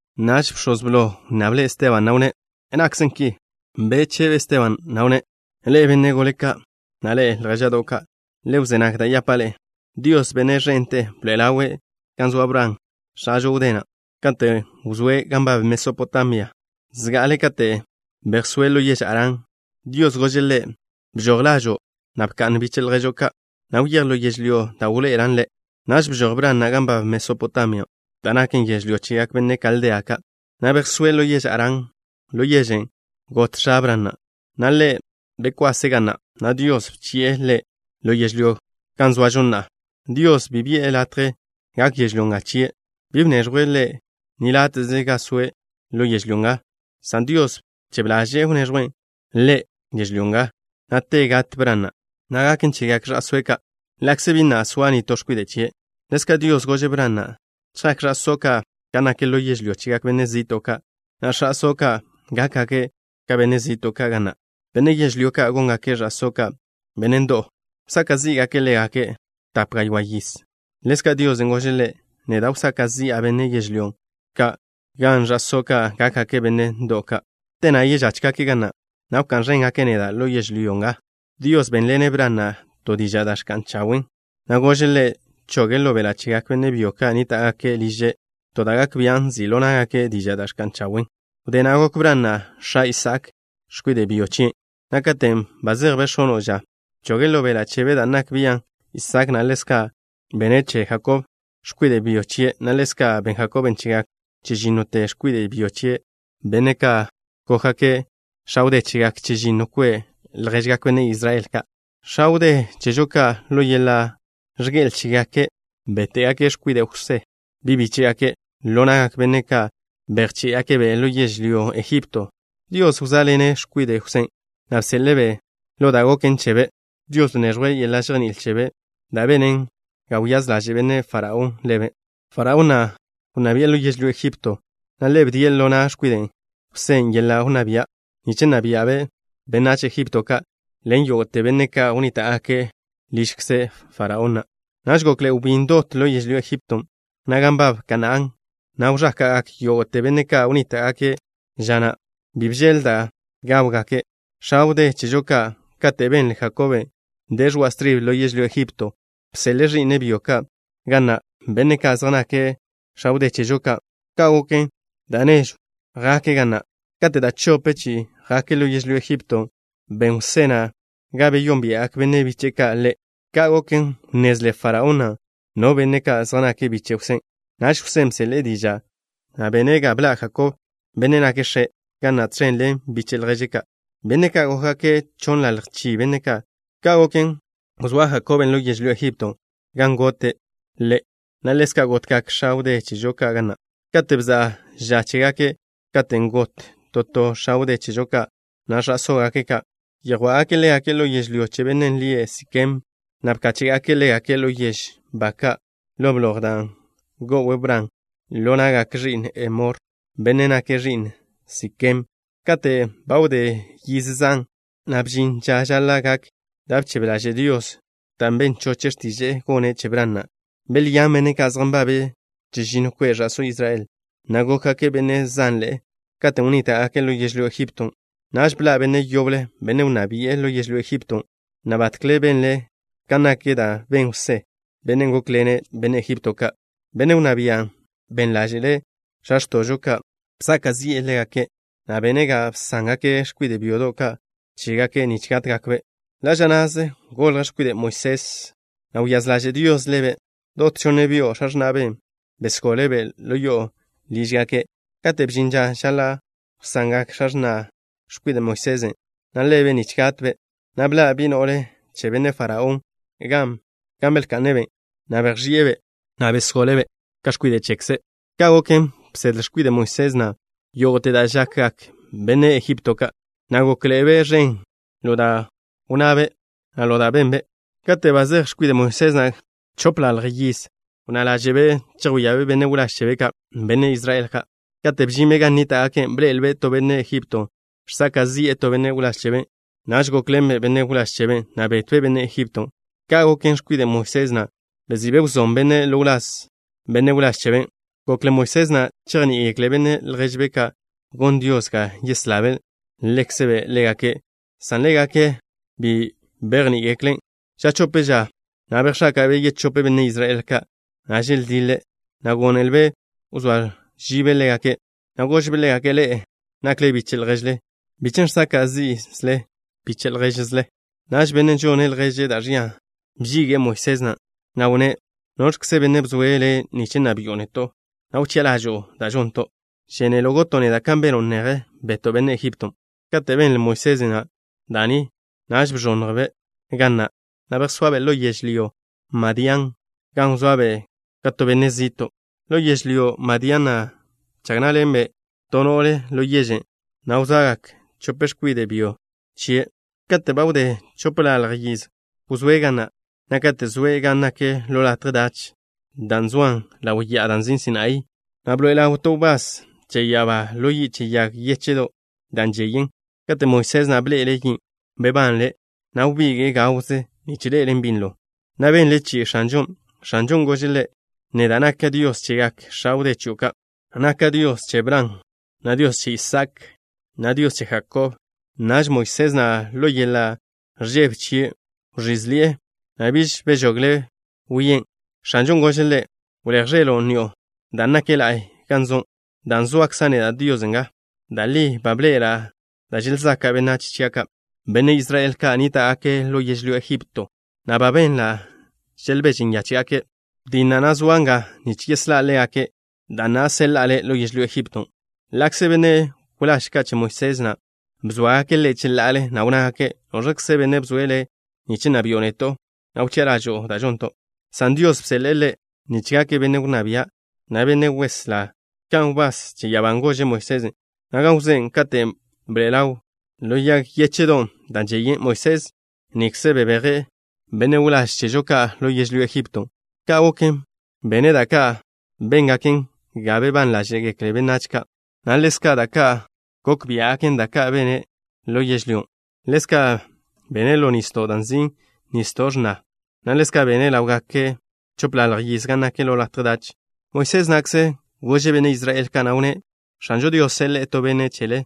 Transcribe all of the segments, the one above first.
Naž bx̱oz blo wnnable' Esteban, na' wnné': —¿Nakkze ki? Bechebe Esteban, na' wnné': —Ḻe'e, benne' gole ka', na' ḻe'e, ljéža'do' ka'. Le wzé nag da' yapa' ḻe'e. Dios, Benne' ẕente, bḻoe'e ḻawe' gan wzóa Bran, x̱ažo wdé na', katen' wzóe' gan nbab Mesopotamia, zga'ale kate' bejsóe' ḻo yež Harán. Dios gože' ḻe': “Bžoj lažo', na' bkwasḻen biche' lježo' ka', na' wyéj ḻo yežlyó da' wḻoe'elan' le'.” Naž bžoj Bran na' gan nbab Mesopotamia, da' naken yežlyó chegak benne' Kaldea ka', na' bejsóe' ḻo yež Harán. Ḻo yežen' got x̱a Bran na', na' ḻe' bekwase' ga na', na' Dios bchi'e ḻe' ḻo yežlyó nga, gan zoažo na'a. Dios bi bi'e ḻe' latje gak yežlyó nga chie'. Bi bneẕjwe' Ḻe' ni láte'ze gan soe' ḻo yežlyó nga, san Dios bchebe ḻaže'e wneẕjwe' Ḻe' yežlyó nga, na' te gat Bran na', na' gaken chegak ẕa'sóe' ka', ḻa'kze bi na' soa nitó x̱kwide' chie'. Ḻezka' Dios gože' Bran na': “Chjak ẕa'só' ka' gan nak ḻo yežlyó chegak benne' zi'to' ka', na' ẕa'só' ka' gákgake' ka benne' zi'to' ka' ga na'. Benne' yežlyón' ka' góngake' ẕa'só' ka' benne' ndo'w ka'. Wsaka' zí'gake' ḻégake' tape gaywá' yiz.” Ḻezka' Dios gože' ḻe': “Neda' wsaka' zi'a benne' yežlyón' ka' gan ẕa'só' ka' gákgake' benne' ndo'w ka', na' te na' žójgake' ga na', na' wká'n ẕéngake' neda' ḻo yežlyó nga.” Dios bénḻene' Bran na' to diža' da' ẕka'n chawen', na' gože' ḻe' choge' ḻo beḻa' chegak benne' byo ka' nníta'gake' liže' to da' gak bian' nzi' ḻo ná'gake' dižan' da' ẕka'n chawen'. Wdé na' gok Bran na' x̱a Isaak, x̱kwide' byo chien', na' katen' ba zejbe' x̱ono' ža, bchoge' ḻo beḻa' chebe' dan' nak bian'. Isaak na', ḻezka' bene' che Jakob, x̱kwide' byo chie', na' ḻezka' ben Jakob chegak chežínnote x̱kwide' byo chie', benne' ka' gókgake' x̱a wdé chegak chežinno kwe' lježgak benne' Israel ka'. ’X̱a wdé chežo ka', ḻo yeḻa' ẕge'el chégake', béte'gake' x̱kwide' Jwsé, bi' bíche'gake', ḻo na'gak benne' ka' bejché'gake'-be' ḻo yežlyó Ejipto. Dios wzóaḻene' x̱kwide' Jwsén', na' beslé'-be' ḻo da' goken chebe'. Dios bneẕjwe' yeḻa' žejní'il chebe', da' benen ga wyáz ḻaže' benne' Faraón ḻebe'. Benne' Faraón wnná bi'e lo yežlyó Ejipto, na' ḻe' bdie' ḻo na' x̱kwide' Jwsén' yeḻa' wnná bia', nich nna bia'be' benách Ejipto ka' ḻen yógo'te benne' ka' wnníta'gake' ližkze Benne' Faraón na'. ’Naž gokḻe'e wbín dot ḻo yežlyó Ejipton', na' gan nbab Kanaán nga, na' wẕáka'gak yógo'te benne' ka' wnníta'gake' ža na'. Bi bžeḻ da' gawgak x̱a wdé chežo ka'. Kate' benle Jakob de ẕoa' stribe ḻo yežlyó Ejipton', bseḻe'e ẕi'ne' byo ka' ga na', benne' ka' zej nake' x̱a wdé chežo ka'. Ka' goken da' nežw chi'i jake' ga na'. Kate' da' chope chi'i jake' ḻo yežlyó Ejipton', ben Jwsé na' ga beyónbia'gak benne' biche'e ka' ḻe'. Ka' goken, wnnezle benne' Faraón no benne' ka' zej nake' biche' Jwsén'. Naž Jwsén' bseḻe'e diža', na' bene' ga bḻa' Jakob, benne' nake' x̱e', ga na', tẕen ḻen biche' lježe' ka', benne' ka' gókgake' chonnḻalj chi benne' ka'. Ka' goken, wzóa Jakob ḻo yežlyó Ejipto, gan gote' ḻe', na' ḻezka' gotgak x̱a wdé chežo ka' ga na' kate' bza'a ža chégake'. Katen' got to to x̱a wdé chežo ka', na' ẕa'sógake' ka' yjwá'gake' ḻégake' ḻo yežlyó che bennen' lie' Sikem, na' bkáche'gake' ḻégake' ḻo yežw ba ka' ḻo blojen' da' go'w Bran ḻo na'gak ẕi'n Hemor, benne' nake' ẕi'n Sikem na'. ’Kate' ba wdé yiz zan, na' bžin ža žaḻa' gak da' bchebe ḻaže' Dios, dan' ben choche' x̱tiže'e gone' che Bran na'. Belyán benne' ka' zej nbabe' chežinno kwe' ẕa'só Israel, na' gókgake' benne' zanḻe'e katen' wnníta'gake' ḻo yežlyó Ejipton'. Naž bḻa' benne' yoble, benne' wnná bi'e ḻo yežlyó Ejipton', na' batkle benle' kan nak da' ben Jwsé, bennen' gókḻene' benne' Ejipto ka'. Benne' wnná bian' ben ḻáže'le' x̱a x̱to'žo ka'. Bsaka' zi'e ḻégake', na' bene' ga bsángake' x̱kwide' byodo' ka' chégake', nich gátgakbe'. Ḻa' ža na'ze golj x̱kwide' Moisés, na' wyáz ḻaže' Dios ḻebe'. Dot chonne byo' x̱a x̱na'be' besgole'-be' lo yo'o lížgake'. Kate' bžin ža žaḻa' wsangak x̱a x̱na' x̱kwide' Moisés na' ḻebe' nich gatbe', na' bḻa' bi' no'le che benne' Faraón gan belka'ne'-be', na' bejx̱i'e-be', na' besgole'-be' ka x̱kwide' chekze'. Ka' goken, bsedle x̱kwide' Moisés na' yógo'te da' žakgak benne' Ejipto ka', na' gókḻe'ebe' ẕen ḻo da' wnnabe', na' ḻo da' benbe'. ’Kate' ba zej x̱kwide' Moisés na' chopḻalj yiz, wnná ḻáže'be' chejwíabe' benne' wláž chebe' ka', benne' Israel ka'. Kate' bžinbe' gan nníta'gake', bḻe'elbe' to benne' Ejipto, žsaka' zi'e to benne' wláž chebe'. Naž gókḻenbe' benne' wláž cheben', na' betbe' benne' Ejipton'. Ka' goken, x̱kwide' Moisés na' bezi'be' wzón bennen' ḻo wláz benne' wláž cheben'. Gokle Moisés na' chejní'igekle benne' lježbe' ka' gon Dios ga yeslabe' ḻekzbe' ḻégake', san ḻégake' bi bejní'igekle'. Ža chope ža na' bejx̱áka'be' yechope benne' Israel ka', na' želdiḻe', na' gónelbe' wzóa žibe' ḻégake', na' gožbe' ḻégake': “Ḻe'e nak biche' lježle. ¿Biẕ chen' žsaka' zi'le biche' lježle?” Naž bennen' žone' lježe' da' ẕia bžige'e x̱kwide' Moisés na', na' wnné': “¿Noẕkze benne' bzoe' le' nich nna bi'o neto', na' wchi'a ḻažo'o da' žonto'? ¿Žénelo' goto' neda' kan beno' neje, beto' benne' Ejipton'?” Kate' benle x̱kwide' Moisés na' da' ni, naž bẕonnjbe' ga na', na' bejsoabe' ḻo yežlyó Madián gan wzoabe' ka to benne' zi'to'. Ḻo yežlyó Madián na' bchag ná'ḻenbe' to x̱kwide' no'le ḻo yežen', na' goljgak chope x̱kwide' byo chie'. ’Kate' ba wdé chopḻalj yiz wzóe' ga na', na' kate' zoe' gan nak ḻo latje dach, da' zoan ḻaw ya'a da' nzin' Sinaí, na' bḻoe'e ḻaw to wbás che ya'abá ḻo yi' che yag yéche'do' da' žeyen. Kate' Moisés na' bḻe'ele' yin', bebanle', na' wbige'e gawze nich ḻe'elen' binlo, na' benle' chi'i X̱anžon'. X̱anžon' gože' ḻe': “Neda' naka' Dios chegak x̱a wdé chio' ka'. Naka' Dios che Bran, na' Dios che Isaak, na' Dios che Jakob.” Naž Moisés na', ḻo yeḻa' ẕžebe chie' wẕízeḻi'e, na' biž bežogle' wien'. X̱anžon' gože' ḻe': “Wléj ẕelo' ni'o, dan' nak la'y gan zo' dan' zoakza' neda', Dios, nga. Da' li ba bḻe'ela' da' želzaka' benách chia' ka', benne' Israel ka' nníta'gake' ḻo yežlyó Ejipto, na' ba benla' želbeže nyáche'gake'. Betja', na' zoa' nga nich yeslá' ḻégake'. Da na'a, seḻa'a le' ḻo yežlyó Ejipton'.” ’Ḻa'kze benne' wláž ka' che Moisés na' bzóagake' ḻe' cheḻa'ale, na' wnnágake': “¿Noẕkze benne' bzoe' le' nich nna bi'o neto', na' wchi'a ḻažo'o da' žonto'?” san Dios bseḻe'e ḻe' nich gake' benne' wnná bia', na' benne' weslá, kan wbás che ya'abán' gože' Moisés na' gan wzóe', katen' bḻoe'e ḻawe' ḻo yag yéche'don' da' žeyen. Moisés nikze bebeje' benne' wláž chežo ka' ḻo yežlyó Ejipton'. Ka' goken, bene' da' ka' béngaken ga bebán ḻáže'gekle benách ka', na' ḻezka' da' ka' gok biá'gaken, da' ka' bene' ḻo yežlyón'. Ḻezka' bene' ḻo nisdo' da' nzin' Nisdo' X̱na, na' ḻezka' bene' ḻáwgake' chopḻalj yiz gan nak ḻo latje dach. Moisés na'kze gože' benne' Israel ka', na' wnné': “X̱anžo Dios seḻe'e to Benne' chele,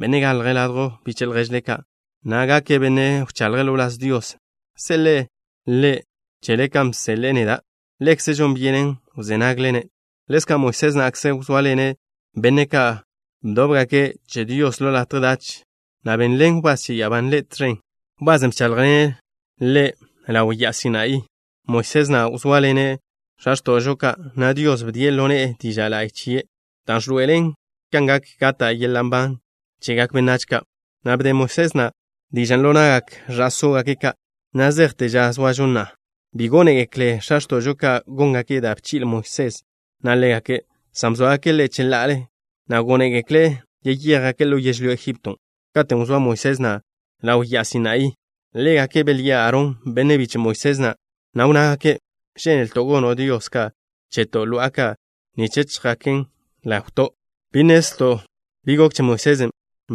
Benne' galje' ladjw biche' lježle ka', na' gake' Benne' wchaḻje' ḻo wláz Dios. Seḻe'e Ḻe' chele kan bseḻe'e neda'. Ḻekze' žon byenen wzé nagle-ne'.” Ḻezka' Moisés na'kze wzóaḻene' benne' ka' bdóbgake' che Dios ḻo latje dach, na' benḻen wbás che ya'abán' ḻe' tẕen, wbasen' bcháḻjḻene' ḻe' ḻaw Ya'a Sinaí na'. Moisés na' wzóaḻene' x̱a x̱to'žo ka', na' Dios bdie' ḻo ne'e diža' la'y chie', da' ẕloe'elen kan gak gata' yeḻa' nban chegak benách ka', na' bde Moisés na' dižan' ḻo na'gak ẕa'sógake' ka' na' zejte ža zoažo na'a. ’Bi gónegekle x̱a x̱to'žo ka' góngake' da' bchi'le Moisés na' ḻégake', san bzóagake' ḻe' cheḻa'ale, na' gónegekle' yeyéjgake' ḻo yežlyó Ejipton'. Katen' wzóa Moisés na' ḻaw Ya'a Sinaí na', ḻégake' belyi'e Aarón, benne' biche' Moisés na', na' wnnágake': “Žénelto' gono' dios ka' cheto', lo'a ka', nich chjaken ḻawto'. Bi nnezlto' bi gok che Moisés,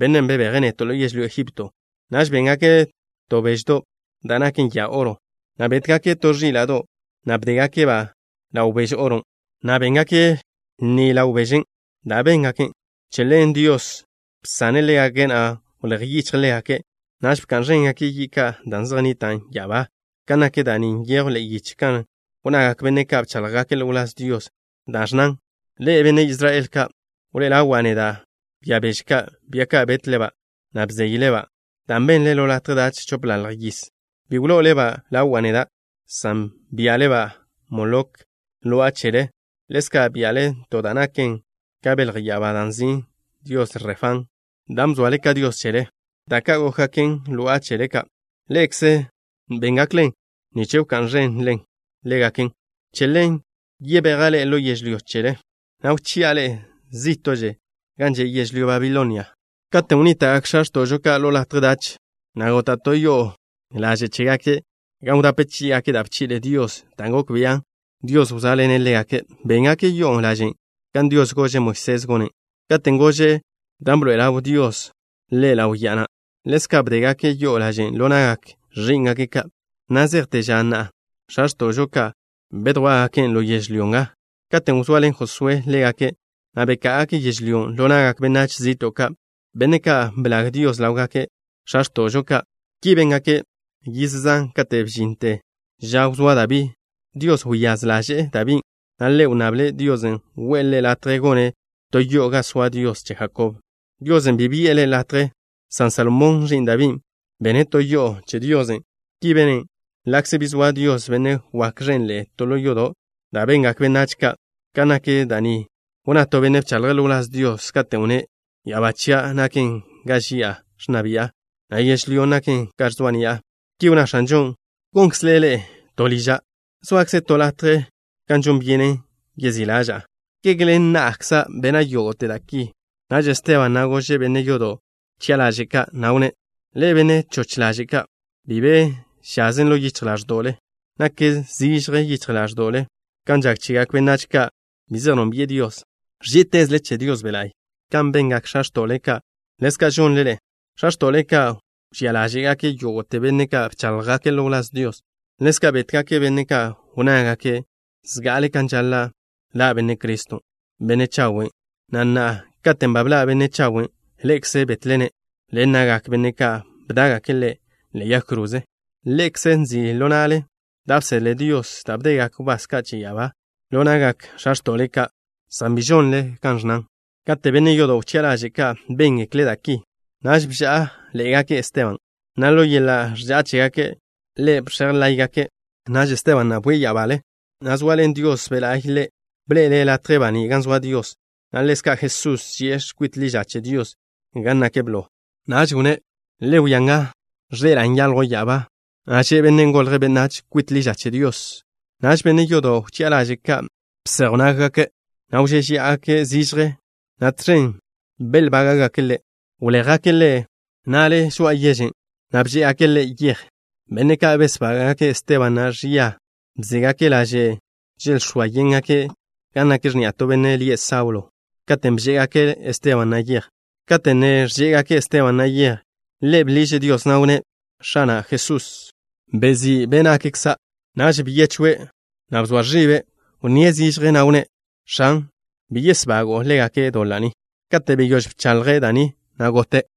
bennen' bebeje' neto' ḻo yežlyó Ejipto.” Naž béngake' to beždo' da' naken ya oro, na' bétgake' to ẕíla'do', na' bdégake'-ba' ḻaw beže oron', na' béngake' lni ḻaw bežen' dan' béngake'. Che ḻen Dios bsane' ḻégake', na' wléj yichje' ḻégake'. Naž bka'n ẕéngake' yi' ka' da' zej nnitan' ya'abá. Kan nak da' ni nyejw ḻe'e yiche kan wnnagak benne' ka' bcháḻjgake' ḻo wláz Dios, da' ẕnnan: Ḻe'e, benne' Israel ka', ¿wlo'ole ḻawa' neda' bia beže ka', bia ka, betle-ba', na' bzeyle-ba', dan' benle ḻo latje dach chopḻalj yiz? Bi wlo'ole-ba' ḻawa' neda', san bia'le Molok, lo'a chelen'. Ḻezka' bia'le to da' naken ka belj ya'abá da' nzin' Dios Refán, dan' bzoale ka dios chele. Da' ka' gókgaken lo'a chele ka'. Ḻe'ekze béngaklen nich bka'n ẕenle ḻégaken. Che ḻen, yebeja' ḻe'e ḻo yežlyó chele, na' wchi'a ḻe'e zí'to'že gan že' yežlyó Babilonia. ’Katen' wnníta'gak x̱a x̱to'žo ka' ḻo latje dach, na' gota' to yo'o laže' chégake' gan wdape chí'igake' da' bchi'le Dios, dan' gok bian' Dios wzóaḻene' ḻégake'. Béngake' yo'o lažen' kan Dios gože' Moisés gonen', katen' gože' ḻe' gonen' kan nak dan' bḻe'ele', da' bḻoe'el Dios ḻe' ḻaw ya'a na'. Ḻezka' bdégake' yo'o lažen' ḻo na'gak ẕí'ngake' ka' na' zejte ža na' x̱a x̱to'žo ka' bedjwá'gaken' ḻo yežlyó nga, katen' wzoaḻen Josué ḻégake', na' beká'agake' yežlyón' ḻo na'gak benách zi'to' ka', benne' ka' blag Dios ḻawgak x̱a x̱to'žo ka'. Ki béngake' yiz zan kate' bžinte ža wzóa Dabí. Dios wyáz ḻaže'e Dabín', na' ḻe' wnnable' Diosen' we'e ḻe' latje gone' to yo'o gan soa Dios che Jakob. Diosen' bi bi'e ḻe' latje, san Salomón, ẕi'n Dabín', bene' to yo'o che Diosen'. Ki bene', ḻa'kze bi zoa Dios, Benne' wak ẕenḻe'e, to ḻo yodo' da' bengak benách ka'. Kan nak da' ni wnná to benne' bchaḻje' ḻo wláz Dios, katen' wnné': Ya'abá chia' naken ga ži'a ẕnna bi'a na' yežlyó naken ga ẕzoa' ni'a. Ki wnná X̱anžon': ¿Gonkzle ḻe'e to liža'? ¿Zoakze to latje gan žon byenen yezí' ḻaža'a? ¿Kege ḻen na'kza' bena' yógo'te da' ki? Naž Esteban na' gože' benne' yodo' wchi'a ḻaže' ka', na' wnné': —Ḻe'e, benne' choch ḻaže' ka', bi be žazen ḻo yichj ḻáẕdo'le. Nak zižje yichj ḻáẕdo'le kan žak chegak benách ka' bi zej nónbi'e Dios. Ẕží'itezle che Dios Be' La'y. Kan bengak x̱a x̱to'le ka', ḻezka' žonle ḻe'e. X̱a x̱to'le ka' wžía ḻáže'gake' yógo'te benne' ka' bcháḻjgake' ḻo wláz Dios. Ḻezka' bétgake' benne' ka' wnnágake' zga'ale kan žaḻa' ḻa' Benne' Criston', Benne' Chawe', na' na'a, katen' bḻa' Benne' Chawen', ḻe'ekze betle-ne' ḻen na'gak benne' ka' bdá'gake' Ḻe' ḻe'e yag kroze. Ḻe'ekze nzi' ḻo na'le da' bsedle Dios, dan' bdegak wbás che ya'abá ka' ḻo na'gak x̱a x̱to'le ka', san bi žonle kan ẕnnan. Kate' benne' yodo' wchi'a ḻaže' ka' béngekle' da' ki, naž bžá'aḻe'egake' Esteban, na' ḻo yeḻa' ẕža'a chégake' ḻe' bx̱ej láygake'. Naž Esteban na' bwie' ya'abale, na' zoaḻen Dios Be' La'y ḻe', bḻe'ele' latje baní' gan zoa Dios, na' ḻezka' Jesusen', zie' kwit ḻi ža che Dios gan nak blo. Naž wnné': —Le wia nga. Ẕḻe'ela' nyaljw ya'abá, na' ze Benne' Golje' Benách kwit ḻi ža che Dios. Naž benne' yodo' wchi'a ḻaže' ka' bséjwgake' nággake', na' wžéžeya'agake' zižje, na' tẕen belbága'gake' ḻe'. Wléjgake' ḻe' na'le žoa'a yežen', na' bžé'egake' ḻe' yej. Benne' ka' besbága'gake' Esteban na' ẕia bségake' laže' želx̱óa yéngake' gan nak x̱ni'a to benne' lie' Saulo katen' bžé'egake' Esteban na' yej. Kate' ne ẕžé'egake' Esteban na' yej, ḻe' bḻiže' Dios, na' wnné': —X̱ana' Jesús. Wẕí' be' nakkza'. Naž byechwe', na' bzoa ẕibe'. Wnníe' zižje, na' wnné': —X̱an. Bi yesbago'o ḻégake' doḻa' ni. Kate' beyóž bchaḻje' da' ni, na' gote'.